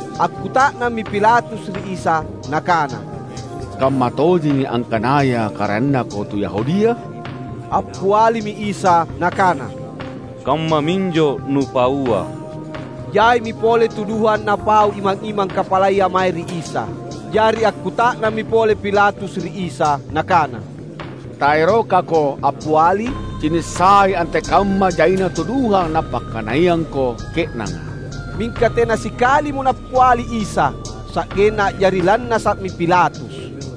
Akkuta’nammi Pilatus ri Isa nakana, "Kammatojengi angkanaya karaennaKo tu Yahudia?" Appialimi Isa Nakana, "Kammaminjo nupaua." Jaimi pole tuduhang napau imang-imang kapalaya mae ri Isa. Jari akkuta’nammi pole Pilatus ri Isa nakana, "TaerokaKo appiali? Cini’ sai antekamma jaina tuduhang napakkanaiangKo ke’nanga!" Mingka tena sikalimo Nappiali Isa. Sa’genna a’jari lannasa’mi Pilatus.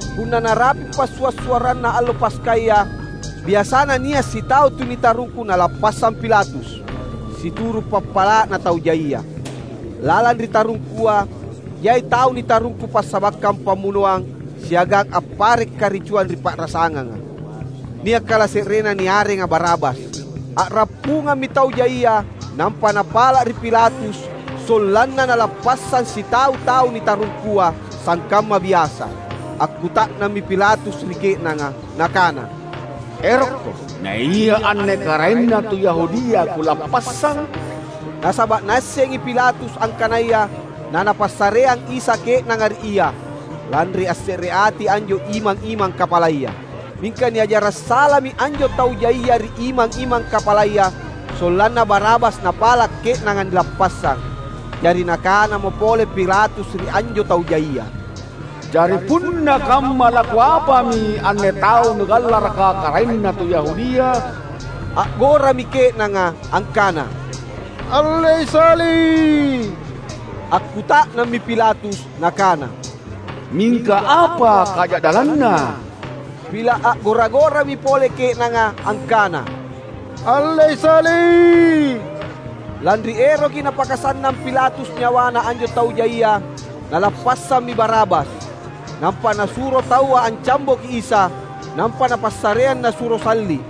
Punna narapi’ Passua’-suarranna allo Paskaya, biasana nia’ sitau tu nitarungku nalappassang Pilatus, situru’ pappala’na tau jaia. Lalang ri tarungkua jai tau nitarungku passabakkang pammunoang siagang appare’ karicuang ri pa’rasanganga. Nia’ kalase’renna niarenga Barabas. A’rappungammi tau jaia, nampa napala’ ri Pilatus sollanna nalappassang sitau tau nitarungkua, sangkamma biasa. Akkuta’nammi Pilatus ri ke’nanga nakana, "Erokko, naia anne karaenna tu Yahudia kulappassang?" Nasaba’ naassengi Pilatus angkanaya nanapassareang Isa ke’nanga ri ia, lanri assereati anjo imang-imang kapalaya. Mingka niajara’ salami anjo tau jaia ri imang-imang kapalaya sollanna Barabas napala’ ke’nanga nilappassang. Jari nakanamo pole Pilatus ri anjo tau jaia, "Jari punna kamma lakuapami anne tau nugallaraka karaenna tu Yahudia?" A’gorami ke’nanga angkana, "Allei salli’!" Akkuta’nammi Pilatus nakana, "Mingka apa kaja’dallanNa?" Pila’ a’gora-gorami pole ke’nanga angkana, "Allei Salli’!" Lanri eroki napakasannang Pilatus nyawana anjo tau jaia, nalappassammi Barabas. Nampa nasuro taua ancamboki Isa, nampa napassareang nasuro salli’.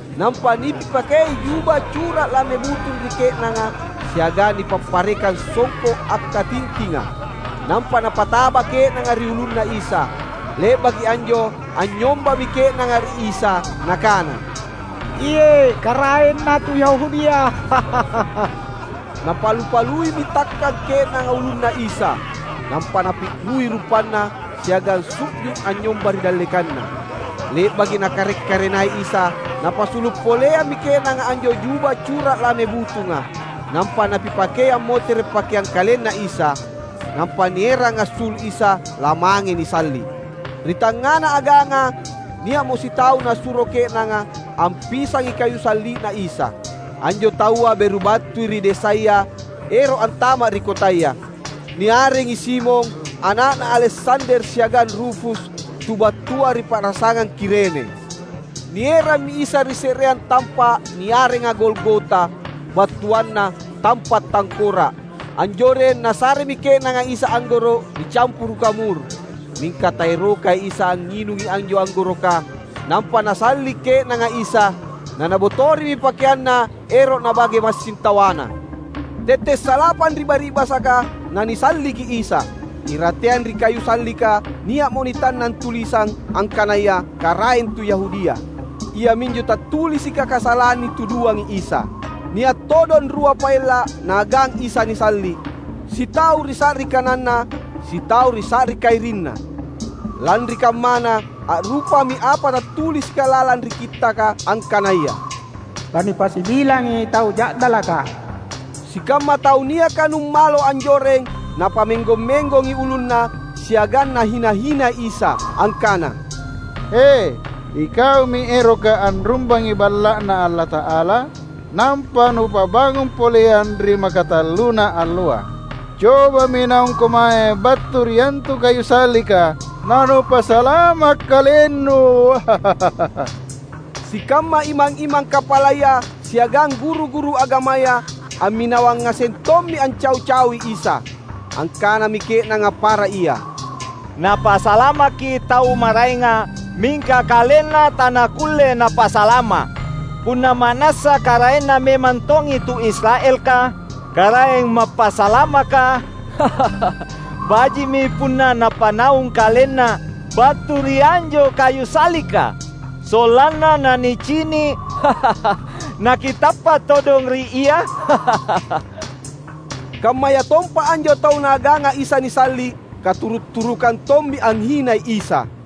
Nampa nipipakei juba cura’ lame butung ri ke’nanga siagang nipapparekang songko’ akkatintinga, nampa napataba ke’nanga ri ulunNa Isa. Le’baki anjo anynyombami ke’nanga ri Isa nakana, "Iye’ Karaenna tu Yahudia." Napalu-paluimi takkang ke’nanga ulunNa Isa, nampa napi’rui rupanNa siagang su’ju’ anynyomba ri dallekanNa. Le’baki nakarek-karenai Isa, napasulu’ poleammi ke’nanga anjo juba cura’ lame butunga, nampa napipakei ammotere’ pakeang KalenNa Isa. Nampa nierang assulu’ Isa, lamange nisalli’. Ri tangngana aganga nia’mo sitau nasuro ke’nanga ampisangi kayu salli’Na Isa. Anjo taua beru battui ri desaya ero’ antama’ ri kotaya. (Niarengi Simon, ana’na Aleksander siagang Rufus tu battua ri pa’rasangang Kirene.) Nierammi Isa ri se’reang tampa’ niarenga Golgota, battuanna "Tampa’ Tangkora’". Anjoreng nasaremi ke’nanga Isa anggoro’ nicampuruka mur, mingka taerokai Isa angnginungi anjo anggoroka. Nampa nasalli’ ke’nanga Isa. Na nabotorimi pakeanNa ero’ nabage massing tawana. Tette’ salapang ri bari’basaka na nisalliki Isa. Irateang ri kayu sallika nia’mo nitannang tulisang angkanaya: "Karaeng Tu Yahudia." Iaminjo tattulisika kasalang nituduangi Isa. Nia’ todong rua paella’ naagang Isa nisalli’. Sitau ri sa’ri kananNa, sitau ri sa’ri kairinNa. [Lanri kammana, a'rupami apa tattulisika lalang ri Kittaka angkanaya, "Lanipasibilangi tau ja'dalaka."] Sikamma tau niaka numalo anjoreng napammenggong-menggongi ulunna, siagang nahina-hinai Isa angkana, "He, iKaumi eroka anrumbangi Balla’Na Allata’ala nampa Nupabangung poleang ri makatalluna alloa. Cobami naungKo mae battu ri antu kayu sallika na Nupasalama’ KalenNu!" Sikamma imang-imang kapalaya siagang guru-guru agamaya amminawang ngaseng tommi ancau-caui Isa. Angkanami ke’nanga para ia, "Napasalamaki tau maraenga, mingka KalenNa tanakulle Napasalama’! Punna ma’nassa karaenna memang tongi tu Israelka, Karaeng Mappasalamaka, baji’mi punna Napanaung KalenNa battu ri anjo kayu sallika, sollanna na nicini’ nakitappa’ todong ri Ia!" Kammayatompa anjo tau naaganga Isa nisalli’, katuru’-turukang tommi anghinai Isa.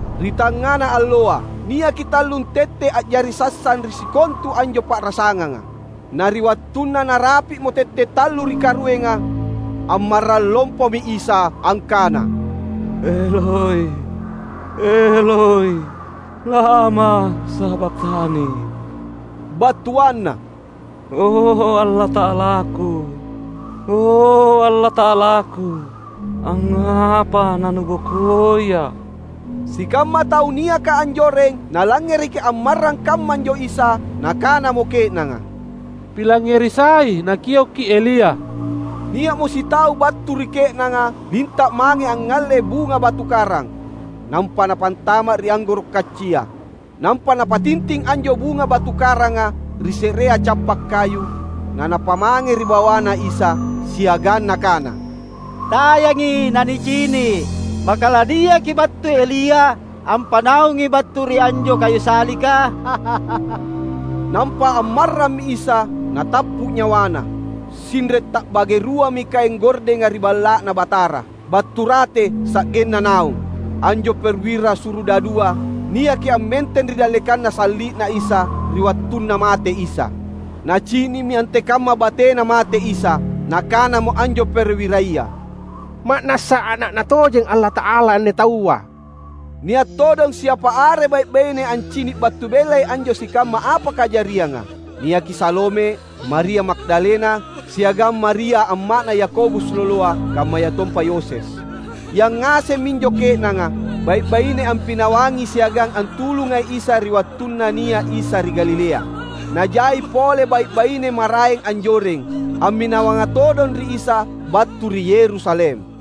Ri tangngana alloa, niaki tallung tette’ a’jari sassang ri sikontu anjo pa’rasanganga. Na ri wattunna narapi’mo tette’ tallu ri karuenga, ammarrang lompomi Isa angkana, "Eloi, Eloi, lama sabakhtani?" battuanna, "O Allata’alaKu, o Allata’alaKu, angngapa na NubokoiA’?" Sikamma tau niaka anjoreng nalangngereki ammarrang kammanjo Isa. Nakanamo ke’nanga, "Pilangngeri sai, Nakioki Elia!" Nia’mo sitau battu ri ke’nanga linta’ mange angngalle bunga batu karang, nampa napantama’ ri anggoro’ kaccia. Nampa napatinting anjo bunga batu karanga ri se’reang cappa’ kayu; na napamange ri bawaNa Isa siagang nakana, "Tayangi, na nicini’, maka laniaki battu Elia ampanaungi battu ri anjo kayu sallika." Nampa ammarrammi Isa, natappu’ nyawaNa. Sinre’ ta’bage ruami kaeng gordenga ri Balla’Na Batara, battu rate sa’genna naung. Anjo perwira surudadua niaki ammenteng ri dallekanna salli’Na Isa ri wattunna mate Isa. Nacini’mi antekamma batena mate Isa. Nakanamo anjo perwiraya, "Ma’nassa Ana’Na tojeng Allata’ala anne taua!" Nia’ todong siapa are bai’-baine ancini’ battu bellai anjo sikamma apa kajarianga. Niaki Salome, Maria Magdalena, siagang Maria amma’na Yakobus loloa, kammayatompa Yoses. Yangaseng minjo ke’nanga, bai’-baine ampinawangi siagang antulungai Isa ri wattunna nia’ Isa ri Galilea. Na jai pole bai’-baine maraeng anjoreng, amminawanga todong ri Isa battu ri Yerusalem.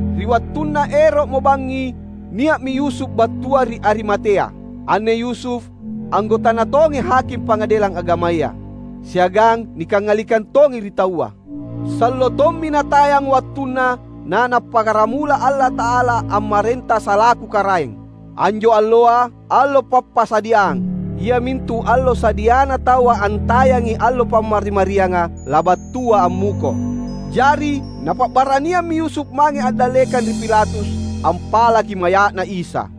Ri wattunna ero’mo bangngi nia’mi Yusuf battua ri Arimatea. Anne Yusuf, anggotana tongi haking Pangadelang Agamaya, siagang nikangalikang tongi ri taua. Sallo tommi natayang wattunna na Napakkaramula Allata’ala ammarenta salaku Karaeng. Anjo alloa, allo Pappasadiang (iamintu allo sadiana taua antayangi allo Pammari-marianga, labattua ammuko). Jari napa’baraniammi Yusuf mange andallekang ri Pilatus, ampalaki maya’Na Isa.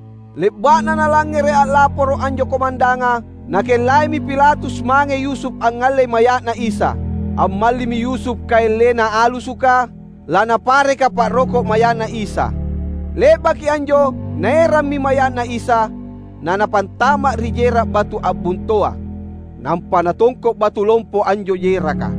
Le’ba’na nalangngere’ a’laporo’ anjo komandanga, nakellaimi Pilatus mange Yusuf angngallei maya’Na Isa. Ammallimi Yusuf kaeng lenang alusuka, lanapareka pa’roko’ maya’Na Isa. Le’baki anjo naerammi maya’Na Isa, na napantama’ ri jera’ batu a’bontoa. Nampa natongko’ batu lompo anjo jeraka.